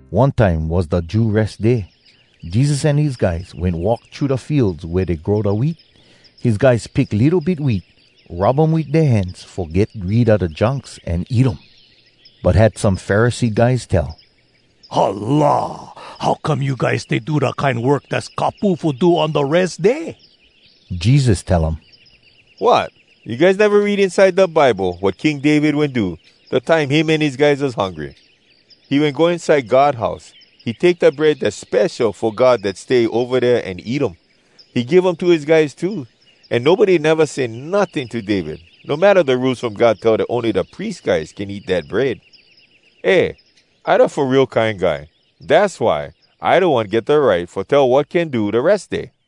One time was da Jew Res Day. Jesus an his guys wen walk thru da fields wea dey grow da wheat. His guys pick litto bit wheat, rub um wit dea hands fo get rid a da junks, an eat um. But had some Pharisee guys tell, “Hala! How come you guys stay do da kine work dass kapu fo do on da Res Day?!” Jesus tell um, “Wot! You guys neva read inside da Bible wat King David wen do, dat time him an his guys was hungry? He wen go inside God house. He take da bread dass spesho fo God dat stay ova dea an eat um. He give um to his guys too. An nobody neva say notting to David, no matta da Rules From God tell dat ony da pries guys can eat dat bread. “Eh! I da Fo Real Kine Guy. Dass why I da One get da right fo tell wat can do da Res Day.”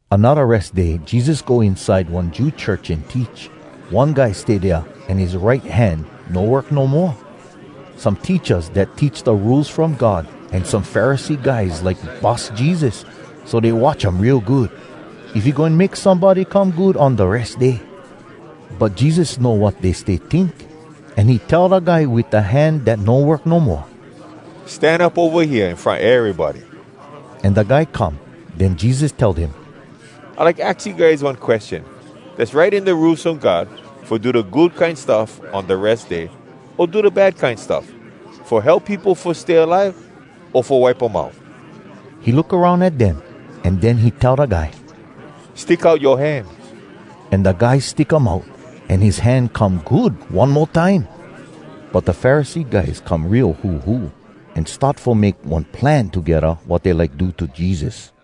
Anodda Res Day Jesus go inside one Jew church an teach. One guy stay dea an his right hand no work no moa. Some teachas dat teach da Rules From God an some Pharisee guys like bus Jesus, so dey watch um real good, if he goin make somebody come good on da Res Day. But Jesus know wat dey stay tink, an he tell da guy wit da hand dat no work no moa, “Stan up ova hea in front erybody.” An da guy come. Den Jesus tell dem, “I like aks you guys one question. Dass right in da Rules From God fo do da good kine stuff on da Res Day, o do da bad kine stuff? Fo help peopo fo stay alive, o fo wipe um out?” He look aroun at dem, an den he tell da guy, “Stick out yoa hand.” An da guy stick um out, an his hand come good one mo time. But da Pharisee guys come real huhu, an start fo make one plan togedda wat dey like do to Jesus.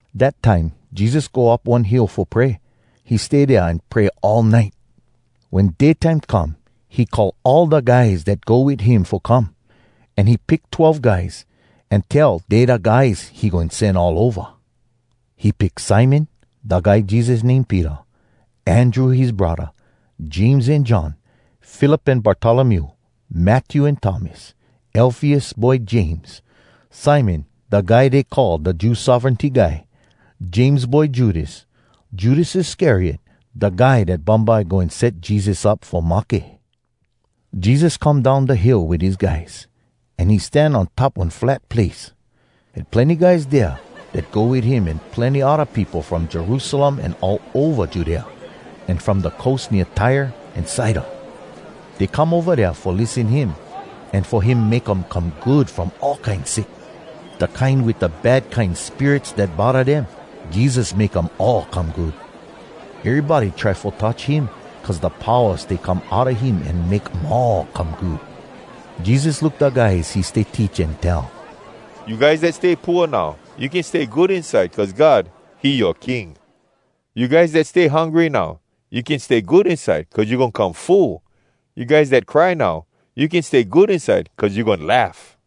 Dat time Jesus go up one hill fo pray. He stay dea an pray all nite. Wen day time come he call all da guys dat go wit him fo come. An he pick twelve guys, an tell dey da guys he goin sen all ova. He pick Simon (da guy Jesus name Peter), Andrew his braddah, James an John, Philip an Bartolomew, Matthew an Thomas, Alfeus boy James, Simon da guy dey call da Jew sovereignty guy, James boy Judas, Judas Iscariot, da guy dat bumbye goin set Jesus up fo mahke. Jesus come down da hill wit his guys, an he stan on top one flat place. Had plenny guys dea dat go wit him an plenny odda peopo from Jerusalem an all ova Judea, an from da coast nea Tyre an Sidon. Dey come ova dea fo lissen him, an fo him make um come good from all kine sick. Da kine wit da bad kine spirits dat bodda dem, Jesus make um all come good. Erybody try fo touch him, cuz da powa stay come outa him an make um all come good. Jesus look da guys he stay teach an tell, “You guys dat stay pooa now, You can stay good inside Cuz God, he yoa King! You guys dat stay hungry now, You can stay good inside Cuz you goin come full! You guys dat cry now, You can stay good inside Cuz you goin laugh!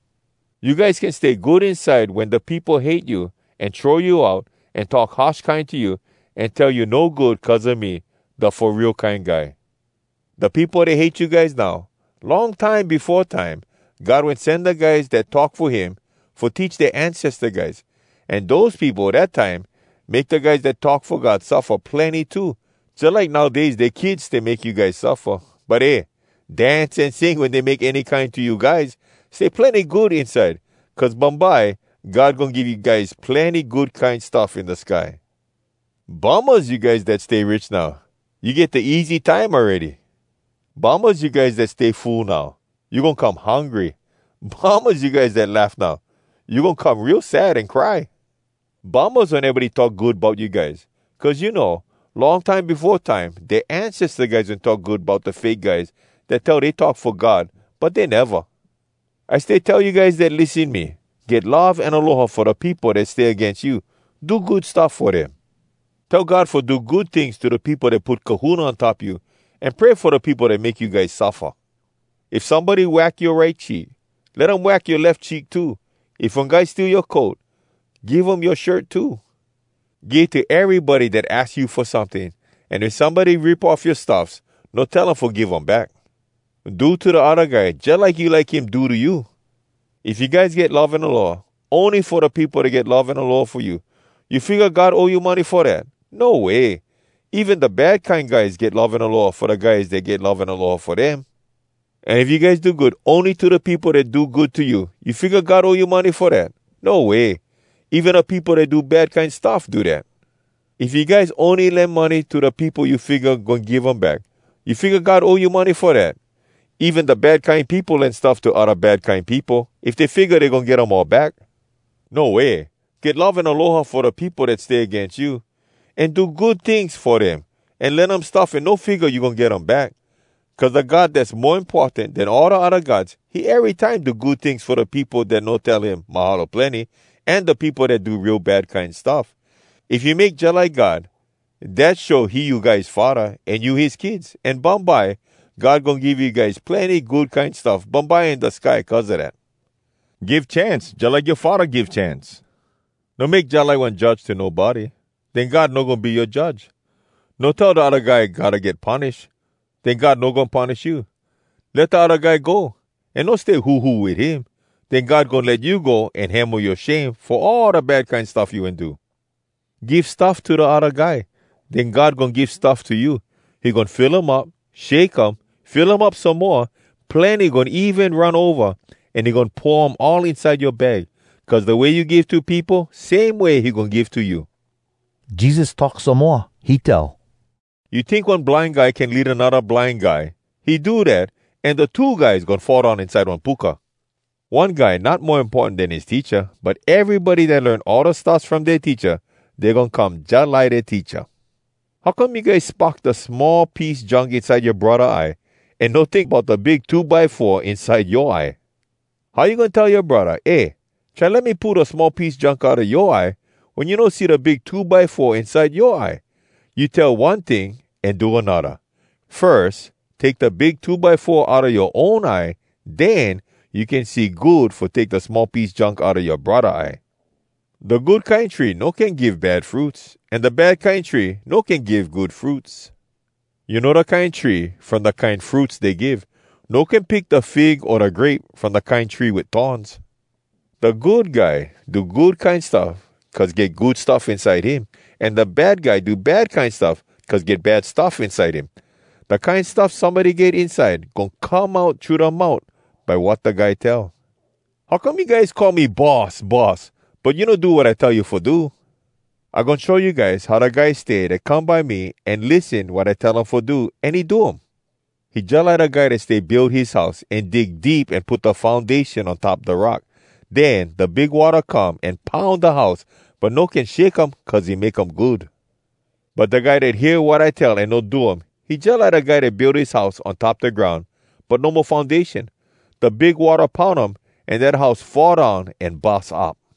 “You guys can stay good inside wen da peopo hate you, an throw you out, an talk harsh kine to you, an tell you no good cuz a me, da Fo Real Kine Guy! Da peopo dat hate you guys now, long time befo time God wen sen da guys dat talk fo him fo teach dea ancesta guys. An dose peopo dat time make da guys dat talk fo God suffa plenny too, jalike nowdays dea kids stay make you guys suffa. But eh! Dance an sing wen dey make any kine to you guys! Stay plenny good inside! Cuz bumbye God goin give you guys plenny good kine stuff in da sky. “Bummahs you guys dat stay rich now! You get da easy time awready. Bummahs you guys dat stay full now! You goin come hungry! Bummahs you guys dat laugh now! You goin come real sad an cry! Bummahs wen erybody talk good bout you guys! Cuz you know, long time befo time dea ancesta guys wen talk good bout da fake guys dat tell dey talk fo God but dey neva.” “I stay tell you guys dat lissen me: Get love an aloha fo da peopo dat stay agains you. Do good stuff fo dem. Tell God fo do good tings to da peopo dat put kahuna on top you, an pray fo da peopo dat make you guys suffa. If somebody wack yoa right cheek, let him wack yoa lef cheek too. If one guy steal yoa coat, give him yoa shirt too. Give to erybody dat aks you fo someting, an if somebody rip off yoa stuffs, no tell him fo give um back. Do to da odda guy jalike you like him do to you. “If you guys get love an aloha ony fo da peopo dat get love an aloha fo you, you figga God owe you money fo dat? No way! Even da bad kine guys get love an aloha fo da guys dat get love an aloha fo dem! An if you guys do good ony to da peopo dat do good to you, you figga God owe you money fo dat? No way! Even da peopo dat do bad kine stuff do dat. If you guys ony lend someting to da peopo you figga goin give um back, you figga God owe you money fo dat? Even da bad kine peopo lend stuff to odda bad kine peopo, if dey figga dey goin get um all back. No way! Get love an aloha fo da peopo dat stay agains you, an do good tings fo dem, an lend um stuff, an no figga you goin get um back! Cuz da God Dass Mo Importan Den All Da Odda Gods, he erytime do good tings fo da peopo dat no tell him ‘Mahalo plenny!’ an da peopo dat do real bad kine stuff. If you make jalike God, dat show he you guys Faddah, an you his kids. An bumbye, God goin give you guys plenny good kine stuff bumbye in da sky cuz a dat. Give chance jalike yoa Faddah give chance. “No make jalike one judge to nobody. Den God no goin be yoa judge. No tell da odda guy gotta get punish. Den God no goin punish you. Let da odda guy go, an no stay huhu wit him. Den God goin let you go an hemo yoa shame fo all da bad kine stuff you wen do. Give stuff to da odda guy. Den God goin give stuff to you. He goin fill um up, shake um, fill um up some moa, plenny goin even run ova, an he goin pour um all inside yoa bag. Cuz da way you give to peopo, same way he goin give to you.” Jesus talk some moa. He tell, “You tink one blind guy can lead anodda blind guy? He do dat, an da two guys goin fall down inside one puka. One guy not mo importan den his teacha, but erybody dat learn all da stuffs from dea teacha, dey goin come jalike dea teacha. “How come you guys spock da small piece junk inside yoa braddah eye, an no tink bout da big two by four inside yoa eye? How you goin tell yoa braddah, ‘Eh, try let me pull da small piece junk outa yoa eye,’ wen you no see da big two by four inside yoa eye? You tell one ting an do anodda! Firs take da big two by four outa yoa own eye, den you can see good fo take da small piece junk outa yoa braddah eye. “Da good kine tree no can give bad fruits, an da bad kine tree no can give good fruits. You know da kine tree from da kine fruits dey give. No can pick da fig o da grape from da kine tree wit thorns. Da good guy do good kine stuff cuz get good stuff inside him, an da bad guy do bad kine stuff cuz get bad stuff inside him. Da kine stuff somebody get inside goin come out thru da mout by wat da guy tell. “How come you guys call me ‘Boss, Boss,’ but you no do wat I tell you fo do? I goin show you guys how da guy stay dat come by me, an lissen wat I tell um fo do, an he do um. He jalike da guy dat stay build his house, an dig deep an put da foundation on top da rock. Den da big watta come, an poun da house, but no can shake um, cuz he make um good. But da guy dat hear wat I tell an no do um, he jalike da guy dat build his house on top da groun, but no mo foundation. Da big watta poun um, an dat house fall down an bus up.”